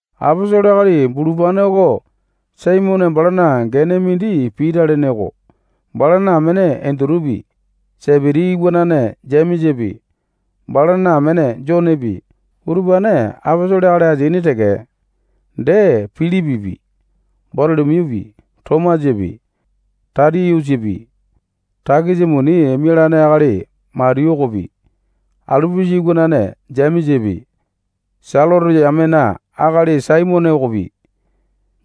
Aposolo akali bulupane oko Saimone balana gene mindi Pita lene oko. Balana amene Endutupi, Sepiti iwanane Jemesapi, balana amene Jonepi, utupane aposolo akali ateaini teke. Dee, Pilipipi, Batolo-miyupi, Tomasapi, Tatiyusapi, takisa muni mialane akali Matiyu okopi, Alipusa iwanane Jemesapi, Selote yamena akali Saimone okopi,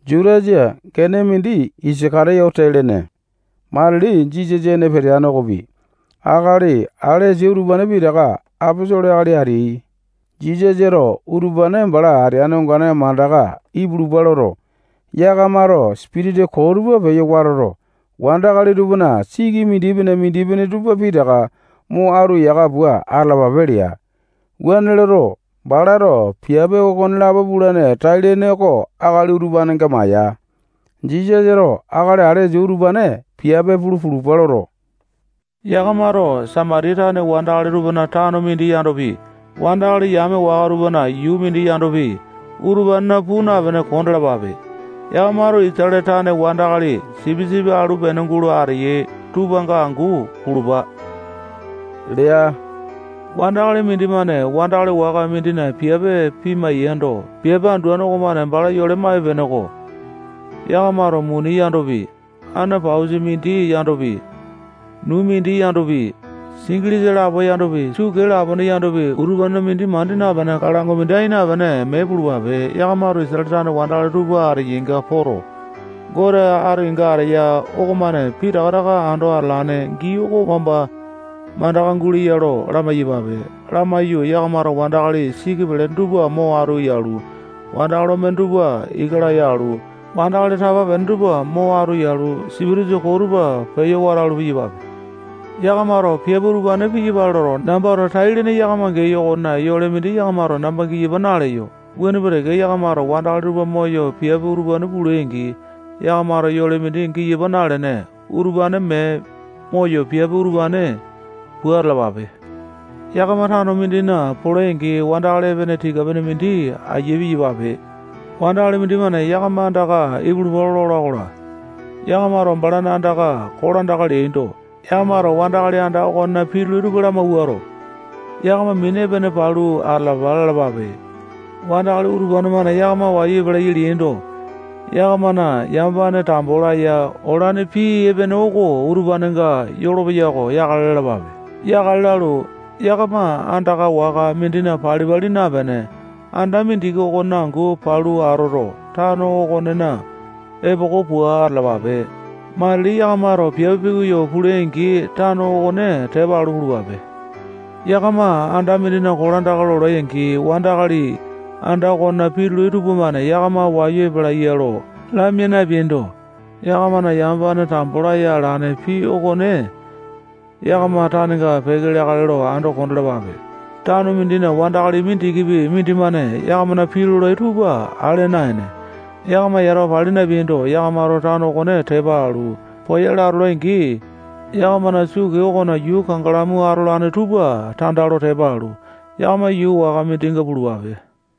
Jutasa gene mindi Isaka-tiyote lene matili Jisasa ene peteane okopi, akali alesa utupane pitaka aposolo akali ateai. Jisasato utupane bala ateane ongane mandaka ipulupa loto, yakamato sipitisa koo tupa peyo watoto, wandakali tupana siki mindipene-mindipene tupa pitaka mo atu yaka pua atalapape lea. Wuane loto, balato piape okonelapo pulane tai-lene oko akali utupanenga maya. Jisasato akali alesa utupane piape pulu pulupa loto, yakamato Samatiya tane wandakali tupana tano mindi yandopi, wandakali yame waka tupana yuu mindi yandopi, utupanena puu napene kondalapape. Yakamato Isatale tane wandakali sipisipi alu pene gulo ateyai tupanga angu pulupa lea. Wandakali mindimane wandakali waka mindina piape pimai-yando, piape anduane okomane bala yole maipe-peneko. Yakamato muni yandopi, ane pausa mindi yandopi, nuu mindi yandopi, singilisa lapo yandopi, sukee lapone yandopi, utupanena mindi mandi napene, kalango mindi ai napene, mee pulupape. Yakamato Isatale tane wandakali tupa ateyainga poto, Gote ati kenga ateya okomane pitaka taka ando atolane gii oko wamba mandaka guleya lo lamai-yapape. Lamaiyu, yakamato wandakali siki pelene tupa mo atu yalu, wandakali omene tupa ika laya alu, wandakali tapa-pene tupa mo atu yalu, sipitisa koo tupa peyo watalu, piyapape. Yakamato piape utupane piyapale loto, nambato tai-lene yakamanga geyo okonena yole mindi yakamato namba giyapa naleyo. Wuane pua teke, yakamato wandakali tupa moyo piape utupane pulai-angi, yakamato yole mindi giyapa nalene, utupane mee moyo piape utupane pua atalapape. Yakama tano mindina polai-angi, wandakali epene tika-pene mindi aiya piyapape. Wandakali mindimane yakama andaka ipulupa lola-kola, yakamato balana andaka kolandaka leaindo, yakamato wandakali anda okonena pitulai tupa lamawuato, yakama mini epene palu atalapa lalapape. Wandakali utupane-mane yakama wayu epalai ya leaindo, yakamana yamapane tambo laya olane pii epene oko utupanenga yolopeya oko yakale lalapape. Yakale lalu, yakama anda waka mindina pali-pali napene, anda mindiki okonena angu palu atoto, tano okonena epoko pua atalapape. Matili yakamato piape pikoyo pulai-angi, tano okone tepa alu pulupape. Yakama anda mindina kolandaka lolai-angi, wandakali anda okonena pitulai tupamane yakama wayu epalaiya lo lamia napeaindo, yakamana yamapane tambo laya alane pii okone yakama tanenga peke leakale lo ando kondalapape. Tano mindina wandakali mindikipi mindimane yakamana pii lolai tupa ale naene, yakama yatawa pali napeaindo, yakamato tano okone tepa alu poyale atolai-angi, yakamana sukee okona yuu kangalamu atolane tupa tanda lo tepa alu, yakama yuu waka mindinga pulupape.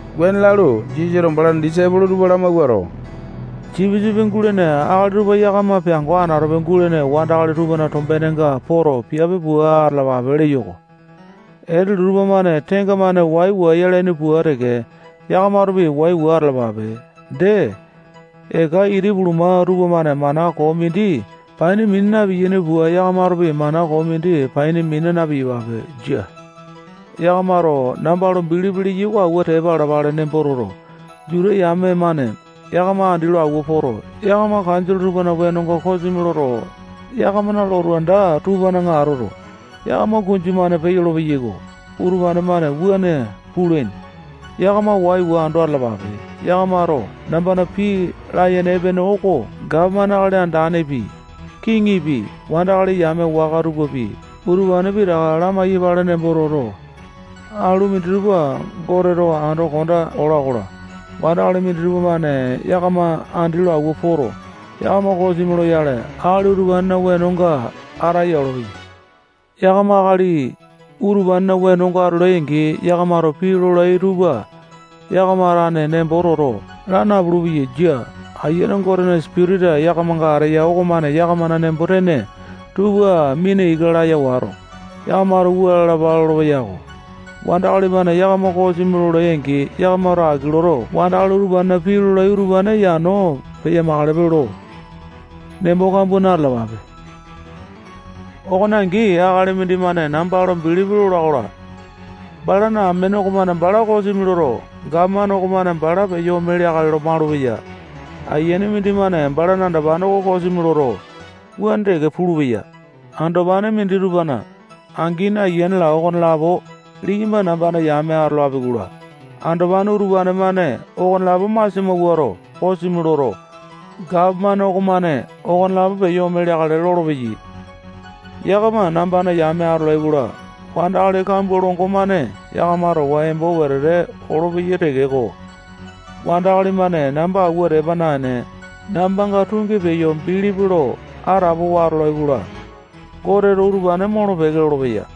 Wuane lalu, Jisasato balana disaipolo tupa lamawuato, sipisipi gulene akali tupa yakama peango anatope gulene wandakali tupana tombenenga poto, piape pua atalapape leyo-ko. Etelu tupamane tenga-mane waiwa yalaini pua teke, yakamatopi waiwa atalapape. Dee, eka iti puluma tupamane mana koo mindi paini mina na-piyaini pua, yakamatopi mana koo mindi paini mina na-piyapape. Jia. Yakamato namba lo bilipi leyai oko awua tepa alapale nembo toto, Juta yame-mane yakama andi lo awua poto, yakamana kanjole tupana wenonga kosimi loto, yakamana lotu anda tupana atoto, yakama kunju-mane peyolo-peyai. Utupane-mane wuane pulaini. Yakama waiwa ando atalapape. Yakamato nambana pii layene epene oko gapomane akali andanepi, kiŋipi, wandakali yame waka tupapi, utupane pitaka lamai-yapale nembo toto, alu minditupa Goteto ando konda ola-kola, wandakali minditupa-mane yakama andi lo awua poto, yakama kosimi loyale, akali utupanena wenonga ataya olopeyai. Yakama akali utupanena wenonga atolai-angi, yakamato pii lolai tupa yakama tane nembo toto, laa napulu-peyai. Jia. Ayiane Gotena Sipitisa yakamanga ateya okomane yakamana nembo-tene tupa mina ika laya wato, yakamato wua lalapa lolopeya-ko. Wandakali-mane yakama kosimi lolai-angi, yakamato aki loto, wandakali utupanena pii lolai utupane yano peya-makalepe lo nembo kambua na-talapape. Okone angi, akali mindimane namba lo bilipi lola-kola, balana amene okomane bala kosimi loto, gapomane okomane bala peyo ome leakale lo malupeya. Ayiane mindimane balana andopane oko kosimi loto, wuane teke pulupeya. Andopane minditupana angini, ayiane-la, okonelapo liyamba nambana yame atolapi-kola, andopane utupane-mane okonelapo masia mawuato, kosimi loto, gapomane okomane okonelapo peyo ome leakale lolopeyai. Yakama nambana yame atolai-kola, wandakali kambua longo-mane yakama towa embo wetete olopeyai tekeko, wandakali-mane namba awua tepa naene, nambanga tungi peyo bilipi lo atapowa atolai-kola, Goteto utupane molo-peke lolopeya.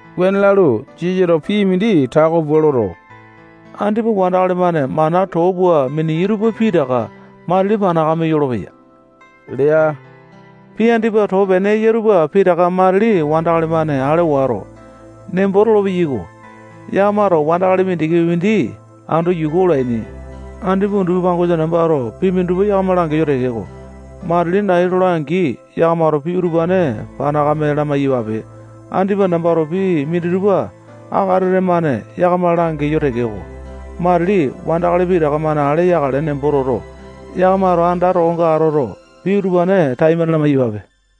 Wuane lalu, Jisasato pii mindi tako pua loto, andipa wandakali-mane mana too pua miniyai tupa pitaka matili panakame yolopeya lea. Pii andipa too pene eya tupa pitaka matili wandakali-mane ale wato, nembo tolo-peyaiko. Yakamato wandakali mindikipi mindi ando yuku olaini. Andipa undupi pangosa nambato pii minditupa yakama langeyo tekeko, matili nai tola-angi, yakamato pii utupane panakame lamai-yapape. Andipa nambato pii minditupa akatete-mane yakama langeyo tekeko, matili wandakali pitaka-mane ale yakale nembo toto, yakamato anda tokonga atoto, pii utupane taimane lalapape.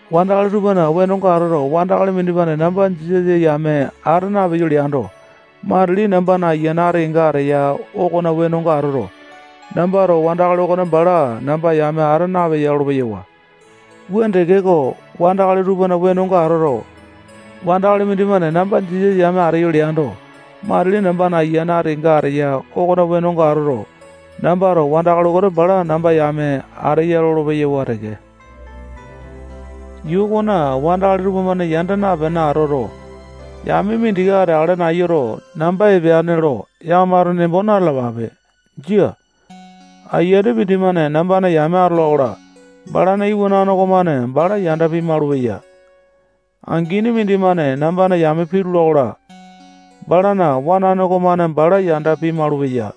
Wandakali tupana wenonga atoto, wandakali mindimane namba Jisasa yame ata napeyo leando, matili nambana ayiane ati kenga ateya okona wenonga atoto, nambato wandakali okone bala namba yame ata napeya lolo-peyawa. Wuane tekeko, wandakali tupana wenonga atoto, wandakali mindimane namba Jisasa yame ateyo leando, matili nambana ayiane ati kenga ateya okona wenonga atoto, nambato wandakali oko bala namba yame ateya lolo-peyawa teke. Yuu okona wandakali tupamane yanda napene atoto, yame mindiki ateakale nayuto, namba epeane lo yakamato nembo na-talapape. Jia. Ayiane mindimane nambana yame atola-kola, balana iwanane okomane bala yanda pimalu-peya. Angini mindimane nambana yame pitula-kola, balana wanane okomane bala yanda pimalu-peya.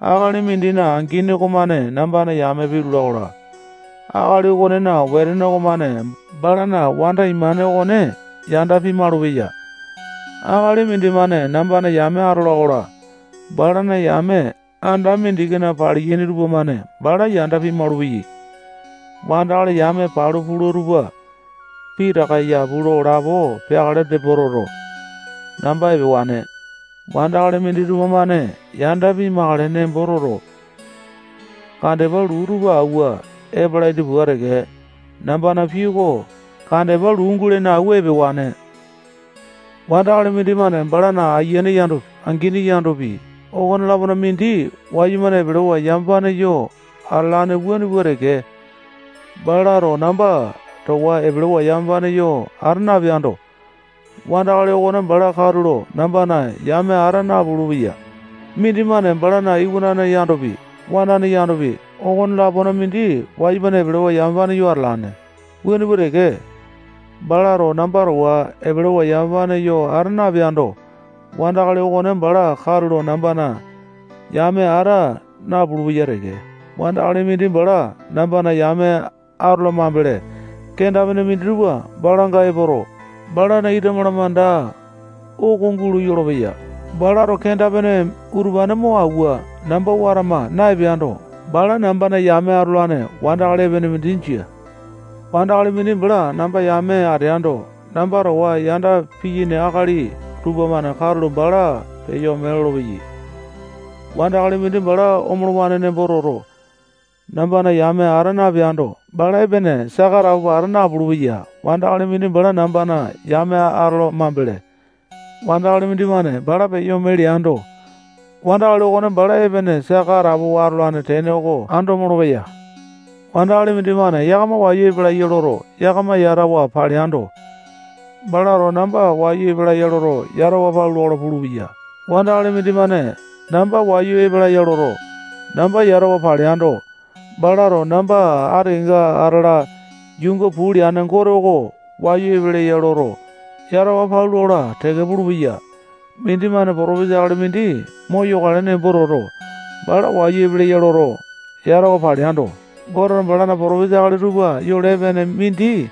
Akali mindina angini okomane nambana yame pitula-kola, akali okonena wetene okomane balana wanda imane okone yanda pimalu-peya. Akali mindimane nambana yame atola-kola, balana yame anda mindikina paliyaini tupamane bala yanda pimalu-peyai. Wandakali yame palu pula tupa pitaka yapu lo lapo peakale nembo toto, namba epewane. Wandakali minditupa-mane yanda pimakale nembo toto, kandepa luu tupa awua epalaini pua teke, nambana pii oko kandepa luu mindi guleya-kola, nambato okone awua epewane. Wandakali mindimane balana ayiane yandopi, angini yandopi, okone-lapona mindi wayumane epelewa yamapane yo atalane wuane pua teke, balato namba towa epelewa yamapane yo ata napeando, wandakali okone bala katulo nambana yame ata napulu-peya. Mindimane balana iwanane yandopi, wanane yandopi, okone-lapona mindi wayumane epelewa yamapane yo atalane wuane pua teke, balato namba towa epelewa yamapane ata napeando, wandakali okone bala katulo nambana yame ata napulu-peya teke. Wandakali mindi bala nambana yame atola mambele, kenda-pene minditupa balanga epoto, balana ita malamanda oko gulo yolopeya. Balato kenda-pene utupane mo awua, namba watama na-epeando, bala nambana yame atolane wandakali epene mindi jia. Wandakali mindi bala nambana yame ateando, namba towa yanda piyaini akali tupamane katulo bala peyo ome lolopeya. Wandakali mindi bala omolowane nembo toto, nambana yame ata napeando, bala epene saka atapowa ata napulu-peya. Wandakali mindi bala nambana yame atola mambele, wandakali mindimane bala peyo ome leando, wandakali okone bala epene saka atapowa atolane tene oko ando molopeya. Wandakali mindimane yakama wayu epalai ya loto, yakama yatawa paleando, balato namba wayu epeleya loto, yatawa palula-kola pulupeya. Wandakali mindimane namba wayu epeleya loto, namba yatawa paleando, balato namba ati kenga atala yuunga puu leane Gote oko wayu epeleya loto, yatawa palula-kola teke pulupeya. Mindimane potopesa akali mindi moyokale nembo toto, bala wayu epeleya loto, yatawa paleando, Goteto balana potopesa akali tupa yole epene mindi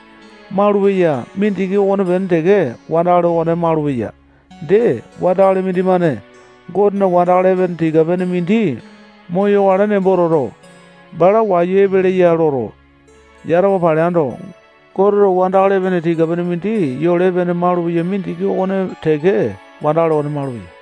maulupeya mindiki okonepene teke wandakali okone maulupeya. Dee, wandakali mindimane Gotena wandakali epene tika-pene mindi moyokale nembo toto, bala wayu epeleya loto, yatawa paleando, Goteto wandakali epene tika-pene mindi yole epene mindi maulupeya mindiki okone teke wandakali okone maulupeya.